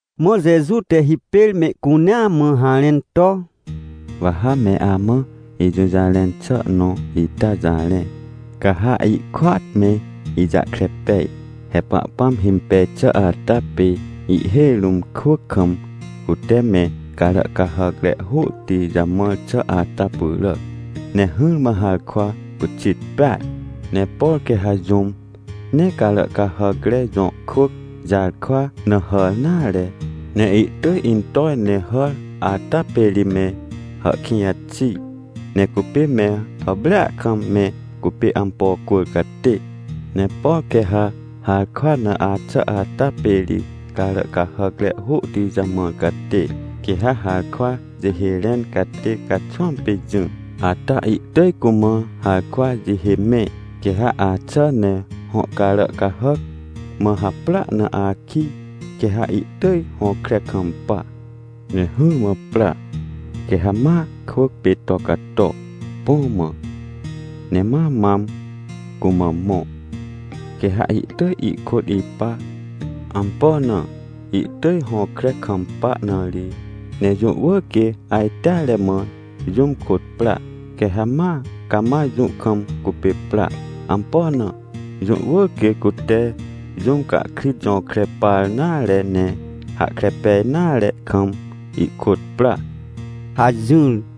Mã Jeju te hipêr mehcunea mã harẽn to: — Wa ha me amã ijũjarẽn xà nõ ita jarẽ. Ca ha ihkôat me ijahkre pej. He Pahpãm himpej xà ata pê ihhêj rũm kwỳc kam, cute me carà cahàcre hôhti jamãr xà ata pyràac. Ne hỹrmã harkwa pyxit peaj. Ne por quê ha jũm nee carà cahàcre jõ kwỳc jarkwa na hàr nare, ne ihtỳj intoj ne hàr ata pê ri me hàhkĩj xi, ne cupê me hàprêa kam me cupê ampo cwỳr catê. Ne por quê ha harkwa na axà ata pê ri carà cahàcre hôhti jamãr catê. Quê ha harkwa jihê rẽn catê caxwãm pê jỹ ata ihtỳj cumã harkwa jihê mẽ, quê ha axà ne hõ carà cahàc mã haprỳa na akij, quê ha ihtỳj hõkre kampa. Ne hỹrmã pra, quê ha ma kwỳc pê to cato, põ mã, ne ma mam cumã mõ, quê ha ihtỳj ihkôt ipa. Ampo na? Ihtỳj hõkre kampa na ri. Ne jũ wỳr quê ajteare mã jũm kôt pra. Quê ha ma cama jũ kam cupê pra. Ampo na? Jũ wỳr quê cute jũm cahkrit jõkre par nare ne hahkre pej nare kam ihkôt pra — hajỹr.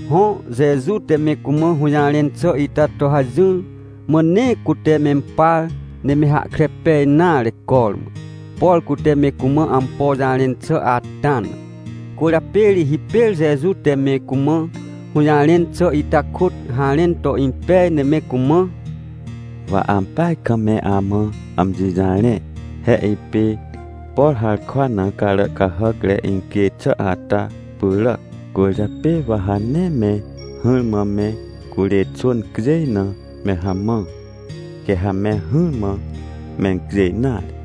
Hõ, Jeju te me cumã hũjarẽn xà ita to hajỹr. Mã nee cute mempar ne me hahkre pej nare cormã, por cute me cumã ampo jarẽn xà ata na. Cwỳrjapê ri hipêr Jeju te me cumã hũjarẽn xà ita kôt harẽn to impej ne me cumã: — Wa ampeaj kam me amã amji jarẽ. He ipê, por harkwa na carà cahàcre incjêj xà ata pyràac. Cwỳrjapê wa ha nee me hỹrmã me curê xwỳn cjêj na me hamãr, quê ha me hỹrmã mencjêj nare.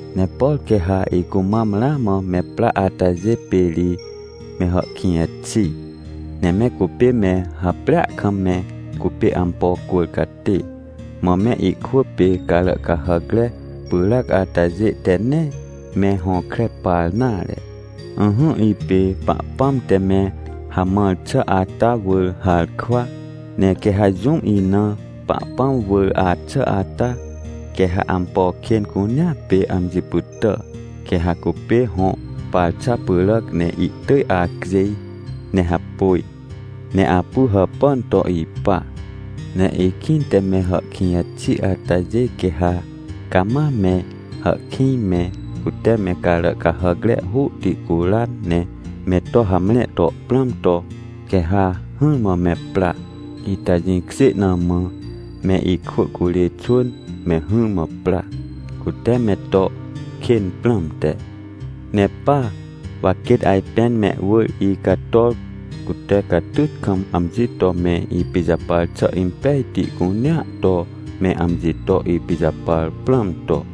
— Ne por quê ha icumam ramã me pra atajê pê ri me hàhkĩj xi, ne me cupê me hàprêa kam me cupê ampo cwỳr catê, mã me ikwỳ pê carà cahàcre pyràc atajê te nee me hõkre par nare. Ỹhỹ, ipê Pahpãm te me hamãr xà ata wỳr harkwa. Ne quê ha jũm ina Pahpãm wỳr axà ata, quê ha ampo kên cunea pê amji pytà. Quê ha cupê hõ parxa pyràc ne ihtỳj acjêj ne hapôj, ne apu hàpàn to ipa. Ne ikĩnte me hàhkĩj xi atajê quê ha cama me hàhkĩj me, cute me carà cahàcre hôhti curan ne me to hamre to prãm to, quê ha hỹrmã me pra. Ita jĩkjê na mã me ikwỳ curê xwỳn me hỹrmã pra, cute me to kên prãmte. Ne pa, wa quêt ajpên mehwỳr icator, cute catyt kam amji to me ipijapar xà impejti cunea to me amji to ipijapar prãm to.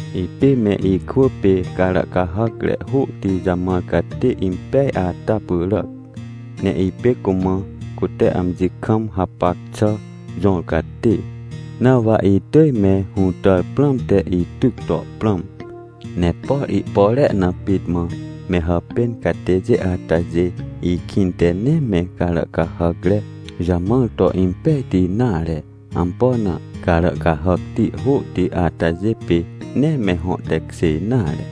— Ipê me ikwỳ pê carà cahàcre hôhti jamãr catê impeaj ata pyràc. Ne ipê cumã cute amji kam hapac xà jõr catê, na wa itỳj me hũtàr prãmte ityc to prãm. Ne por ihpore na pit mã me hàpên catêjê atajê ikĩnte nee me carà cahàcre jamãr to impejti nare. Ampo na? Carà cahàcti hôhti atajê pê nee me hõ tekjê nare.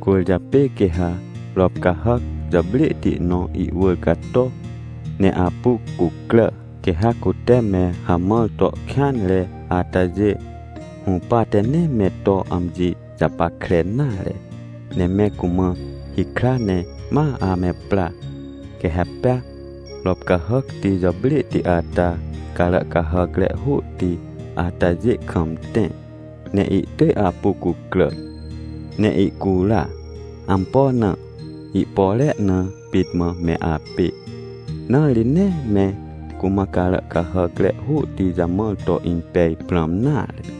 Cwỳrjapê quê ha rop cahàc jàprêhti nõ ihwỳr cato ne apu cucrà, quê ha cute me hamãr to kêanre atajê hũpate nee me to amji japackre nare, ne me cumã hikra, ne ma ame pra. Quê ha pea rop cahàcti jàprêhti ata carà cahàcre hôhti atajê kam tẽ, ne ihtỳj apu cucrà ne ihcura. Ampo na? Ihpore na pit mã me apê, na ri nee me cumã carà cahàcre hôhti jamãr to impej prãm nare.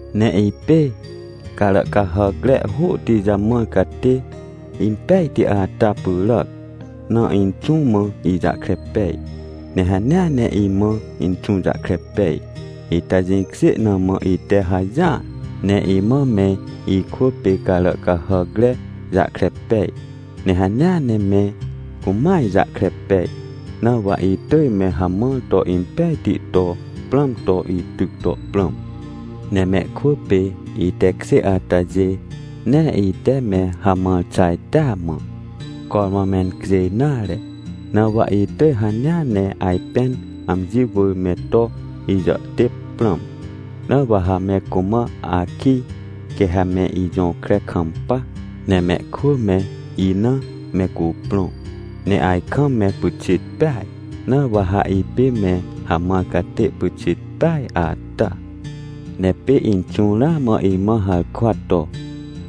— Ne ipê carà cahàcre hôhti jamãr catê impejti ata pyràac na Inxũ mã ijahkre pej, ne hanea ne imã Inxũ jahkre pej. Ita jĩkjê na mã ite hajỹar, ne imã me ikwỳ pê carà cahàcre jahkre pej, ne hanea ne me cumã ijahkre pej. Na wa itỳj me hamãr to impejti to prãm to ityc to prãm. Ne mehkwỳ pê itekjê atajê, nee ite me hamãr xà ita mã cormã mencjêj nare. Na wa itỳj hanea ne ajpên amji wỳr me to ijàhtêp prãm. Na wa ha me cumã akij, quê ha me ijõkre kampa, ne mehkwỳ me ina me cuprõ, ne ajkam me pyxit peaj. Na wa ha ipê me hamãr catê pyxit peaj ata. — Ne pê Inxũ ramã imã harkwa to: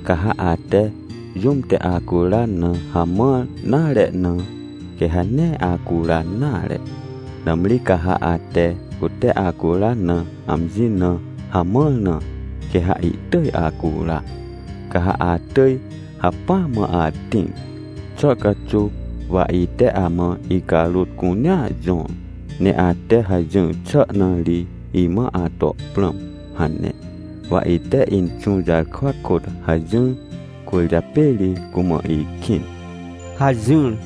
“Ca ha ate jũm te acuran na hamãr nare na, quê ha nee acuran nare. Nãmri ca ha ate cute acuran na amji na hamãr na, quê ha ihtỳj acura, ca ha atỳj hacpỹa mã atĩr. Xà caxuw wa ite amã icarôt cunea jõr, ne ate hajỹr xà na ri imã ato prãm” hane. Wa ite Inxũ jarkwa kôt hajỹr, cwỳrjapê ri cumã ikĩn — hajỹr.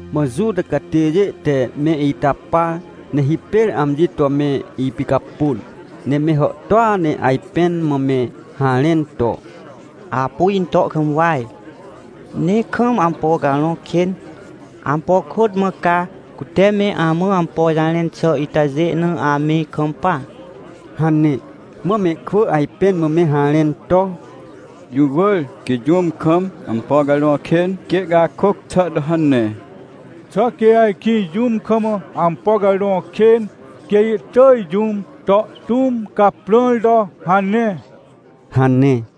Mã Juta catêjê te me ita par, ne hipêr amji to me ipicapôn. Ne me hàhtôa ne ajpẽn mã me harẽn to: — Apu into kam waj! Ne kam ampo carõ kên! Ampo kôt mã ca, cute me amã ampo jarẽn xà itajê na ame kampa? — hane. Mã mehkwỳ ajpẽn mã me harẽn to: — Jũ wỳr quê jũm kam ampo carõ kên quê ihcakôc xà to hane! Xà quê ajkĩ jũm kam ampo carõ kên quê ihtỳj jũm to tũm caprãr to hane? — hane.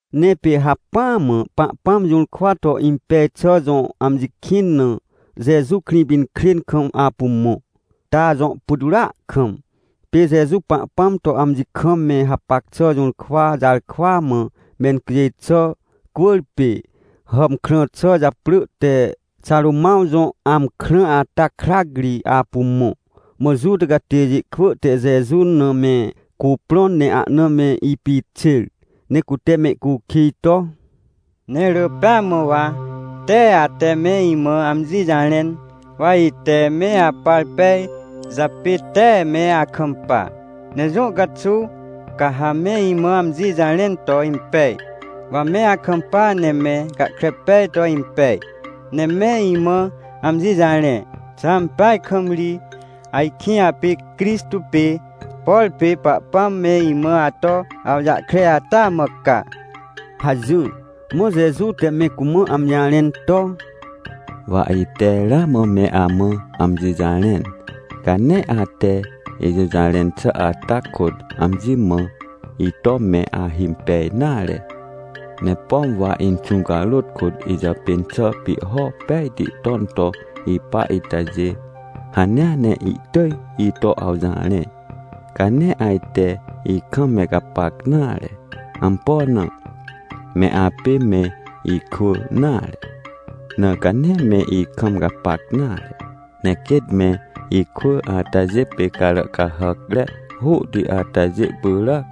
Ne pê hacpỹa mã Pahpãm jũrkwa to impej xà jõ amji kĩn na, Jeju Krĩpinkrên kam apu mõ, ta jõ putwrỳa kam. Pê Jeju Pahpãm to amji kam me hapac xà jũrkwa jarkwa mã mencjêj xà cwỳrpê hàmkrã xà japrỳ te Xarômãw Jõ Amkrã ata krac ri apu mõ. Mã Juta catêjê kwỳ te Jeju na me cuprõn, ne ahna me ipixêr, ne cute mehcukij to: — Ne rỳ pêa mã wa tee ate me imã amji jarẽn, wa ite me apar pej japê tee me akampa. Ne jũ caxuw ca ha me imã amji jarẽn to impej, wa me akampa ne me gahkre pej to impej? Ne me imã amji jarẽ, xà ampeaj kam ri ajkĩ apê Crixtô pê, por pê Pahpãm me imã ato awjahkre ata mã ca? — hajỹr. Mã Jeju te me cumã amji jarẽn to: — Wa ite ramã me amã amji jarẽn, ca nee ate ijũjarẽn xà ata kôt amji mã ito me ahimpej nare. Ne pom wa Inxũ carôt kôt ijàpên xà pihho pejti ton to ipa itajê, hanea ne ihtỳj ito awjarẽ. Ca nee ajte ikam me gapac nare. Ampo na? Me apê me ikwỳ nare, na ca nee me ikam gapac nare. Ne quêt me ikwỳ atajê pê carà cahàcre hôhti atajê pyràac,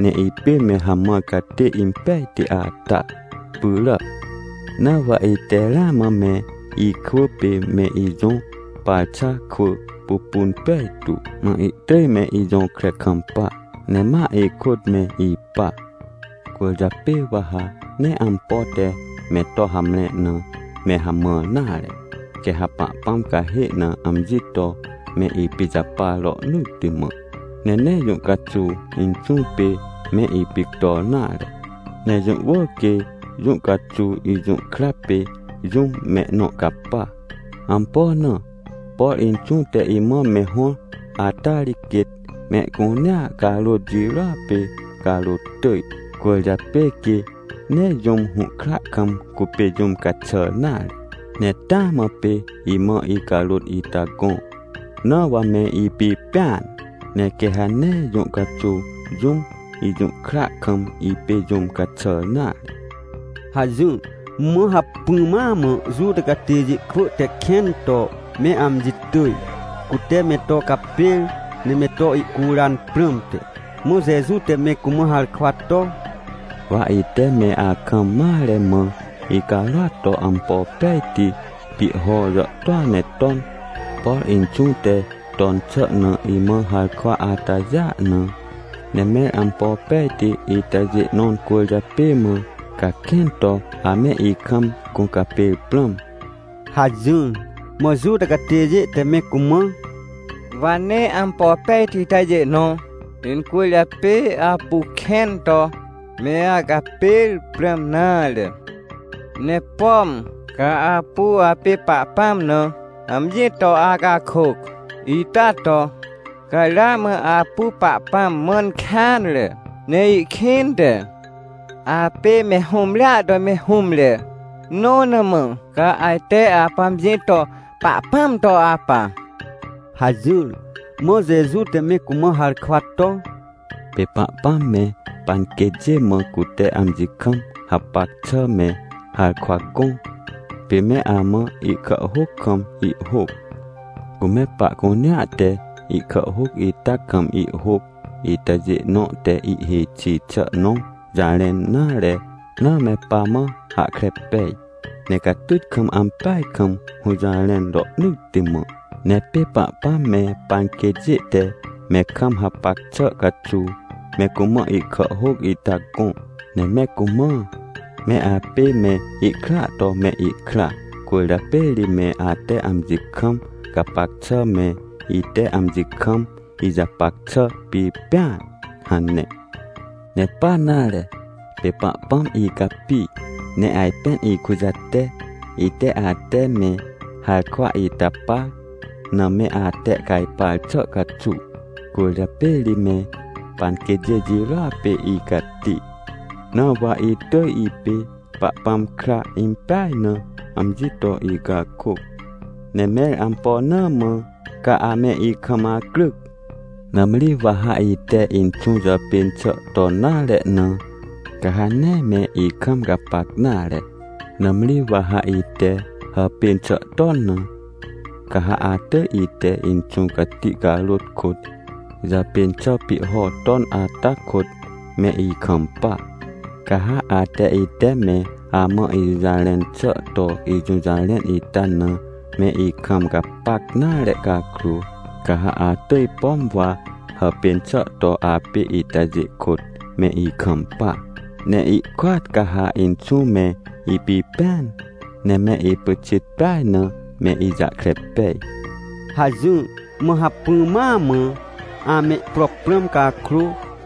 ne ipê me hamãr catê impejti ata pyràac. Na wa ite ramã me ikwỳ pê me ijõ parxa kwỳ pupun pejtu, mã ihtỳj me ijõkre kampa, ne ma ikôt me ipa. Cwỳrjapê wa ha nee ampo te me to hamre na me hamãr nare, quê ha Pahpãm cahê na amji to me ipijapar rohnỳtti mã, ne nee jũ caxuw Inxũ pê me ipictor nare. Ne jũ wỳr quê jũ caxuw ijũhkra pê jũm mehnõ capa. Ampo na? Por Inxũ te imã me hõr ata ri quêt mehcunea carôt jirôa pê carôt tỳj, cwỳrjapê quê nee jũm hũhkra kam cupê jũm caxàr nare. Ne taa mã pê imã icarôt ita gõ, na wa me ipipẽan. Ne quê ha nee jũ caxuw jũm ijũhkra kam ipê jũm caxàr nare — hajỹr. Mã hacpỹ ma mã Juta catêjê kwỳ te kẽn to me amji tỳj, cute me to capêr, ne me to ihcuran prãmte. Mã Jeju te me cumã harkwa to: — Wa ite me akam mare mã icarôat to ampo pejti pihho jàhtôa ne ton, por Inxũ te ton xà na imã harkwa atajêa na. Ne mẽr ampo pejti itajê nõ incwỳrjapê mã, ca kẽn to ame ikam gũcapêr prãm? — hajỹr. Mã Juta catêjê te me cumã: — Wa nee ampo pejti itajê nõ incwỳrjapê apu kẽn to me acapêr prãm nare, ne pom ca apu apê Pahpãm na amji to acakôc, ita to ca ramã apu Pahpãm mãn kêanre. Ne ihkĩnte apê me hũmrea to me hũmre, nõ na mã ca ajte apu amji to Pahpãm to apa — hajỹr. Mã Jeju te me cumã harkwa to: — Pê Pahpãm me panquêtjê mã cute amji kam hapac xà me harkwa gõ, pê me amã ihkàhhôc kam ihhôc. Cu me pahcunea te ihkàhhôc ita kam ihhôc itajê nõ te ihhêj xi xà nõ jarẽn nare na me pamã hahkre pej. Ne catyt kam ampeaj kam hũjarẽn rohnỳtti mã. Ne pê Pahpãm me panquêtjê te me kam hapac xà caxuw me cumã ihkàhhôc ita gõ, ne me cumã: “Me apê me ikraa to me ikra, cwỳrjapê ri me ate amji kam gapac xà me, ite amji kam ijapac xà pipẽan” hane. — Ne pa nare, pê Pahpãm icapi ne ajpên ikujate, ite ate me harkwa ita par na me atehcajpar xà caxuw. Cwỳrjapê ri me panquêtjê jirôa pê icati. Na wa itỳj ipê Pahpãm kra impeaj na amji to icakôc. Ne mẽr ampo na mã ca ame ikam acryc? Nãmri wa ha ite Inxũ jàpên xà ton nare na, ca ha nee me ikam gapac nare. Nãmri wa ha ite hàpên xà ton na, ca ha atỳj ite Inxũ Cati carôt kôt jàpên xà pihho ton ata kôt me ikampa. Ca ha ate ite me amã ijũjarẽn xà to ijũjarẽn ita na me ikam gapac nare cakrô, ca ha atỳj, pom wa hàpên xà to apê itajê kôt me ikampa. Ne ihkôat ca ha Inxũ me ipipẽan, ne me ipyxit peaj na me ijahkre pej — hajỹr. Mã hacpỹ ma mã amehpro prãm cakrô,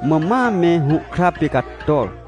mã ma me hũhkra pê cator.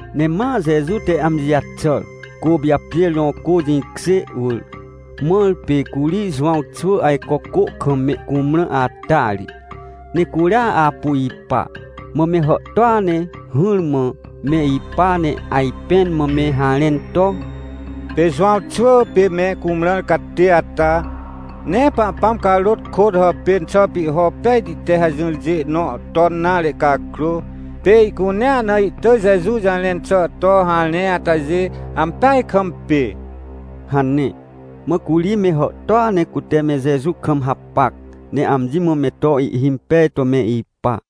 Ne ma Jeju te amji jaxàr, Côpijapjêr jõ cô jĩkjê wỳr, mãr pê curi Jowãw xwỳ ajco cô kam mehcumrã ata ri. Ne curia apu ipa. Mã me hàhtôa ne hỹrmã me ipa, ne ajpẽn mã me harẽn to: — Pê Jowãw xwỳ pê me cumrãr catê ata, nee Pahpãm carôt kôt hàpên xà pihho pejti te hajỹrjê nõ ton nare cakrô, pê ihcunea na ihtỳj Jeju jarẽn xà to harẽ atajê, ampeaj kam pê — hane. Mã curi me hàhtôa ne cute me Jeju kam hapac, ne amji mã me to ihhimpej to me ipa.